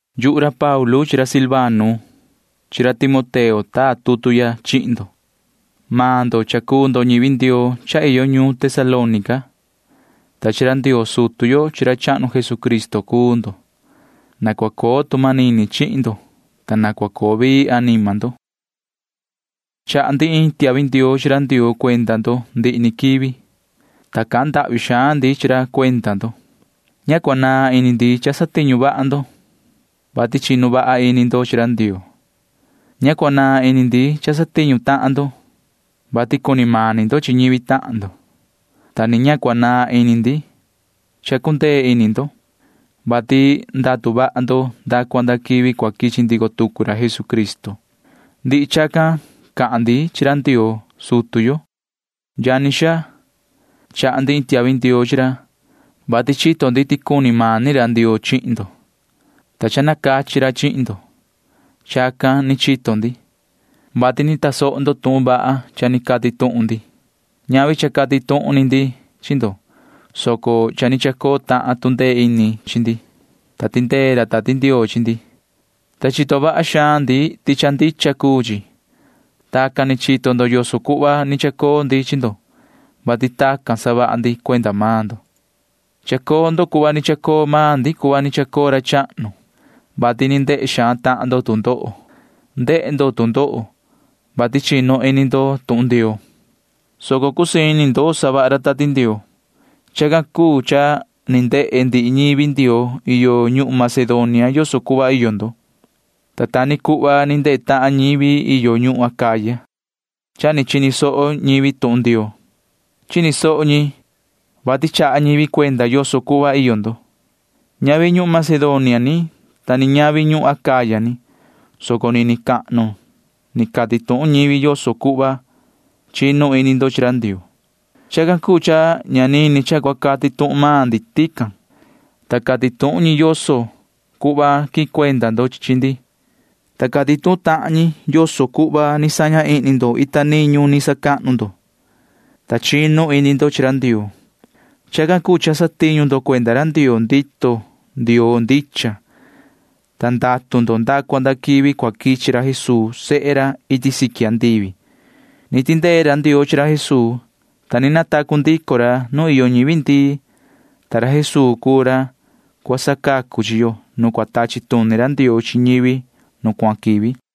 Yuhu ra Paulu chi ra Silvano chi ra Timoteo taa tutu ya chihin ndo. Maan ndo cuu ñivi Ndioo iyo ñuun Tesalónica, ta chi ra Ndioo sutu yo chi ra chahnu Jesucristo cuu ndo. Na cua coo tu manini chihin ndo, ta na cua coo vii anima ndo. Chaha ndi iin tiahvi ndioo chi ra Ndioo cuenda maan ndo ndihi ni quivi, ta cahan ndahvi xaan ndi chi ra cuenda maan ndo. Ña cua naan ini ndi cha satiñu vaha ndo, vati chinu vaha ini ndo chi ra Ndioo. Ña cua naan ini ndi cha satiñu tahan ndo, vati cuni mani ndo chi ñivi tahan ndo, ta ni ña cua naan ini ndi cha cundee ini ndo, vati ndatu vaha ndo nda cua nda quivi cua quichi ndico tucu ra Jesucristo. Ndihi chacan cahan ndi chi ra Ndioo sutu yo. Yani xaa, chaha ndi iin tiahvi ndioo chi ra, vati chito ndi ti cuni mani ra Ndioo chihin ndo, ta cha ni nacachi ra chihin ndo. Chacan ni chito ndi, vati ni tasoho ndo tuhun vaha cha ni cati tuhun ndi. Ñavi cha cati tuhun ni ndi chi ndo, soco cha ni chacoo tahan tu ndee ini chi ndi, ta tindee ra Tati Ndioo chi ndi, ta chito vaha xaan ndi ti cha ndicha cuu chi. Tacan ni chito ndo yoso cuhva ni chacoo ndi chi ndo, vati tacan ni savaha ndi cuenda maan ndo. Chacoo ndo cuhva ni chacoo maan ndi cuhva ni chacoo ra chahnu, vati ni ndehe xaan tahan ndo tu ndoho. Ndehe ndo tu ndoho, vati cha chinu ini ndo tuhun Ndioo, soco cusii ini ndo ni savaha ra Tati Ndioo. Chacan cuu cha ni ndehe ndihi ñivi Ndioo iyo ñuhun Macedonia yoso cuhva iyo ndo, ta ta ni cuhva ni ndehe tahan ñivi iyo ñuhun Acaya. Cha ni chini soho ñivi tuhun Ndioo. Chini soho ñi, vati chaha ñivi cuenda yoso cuhva iyo maan ndo. Ñavi ñuhun Macedonia ni ta ni ñavi ñuhun Acaya ni, soco nini cahnu ni cati tuhun ñivi yoso cuhva chinu ini ndo chi ra Ndioo. Chacan cuu cha ña nini ca cha cua cati tuhun maan ndi tican. Suvi ñi cati tuhun ñi yoso cuhva quihin cuenda ndo chi ndi, ta cati tuhun tahan ñi yoso cuhva ni saña ihni ndo ita niñu ni sacahnu ndo, ta chinu ini ndo chi ra Ndioo. Chacan cuu cha satiñu ndo cuenda ra Ndioo ndito Ndioo ndicha, ta ndatu ndo nda cua nda quivi cua quichi ra Jesuu sehe ra iti siqui andivi. Ni tindee ra Ndioo chi ra Jesuu, ta ni natacu ndico ra nu iyo ñivi ndii, ta suvi ra Jesuu cuu ra cua sacacu chi yo nu cua tachi tuni ra Ndioo chi ñivi nu cuahan quivi.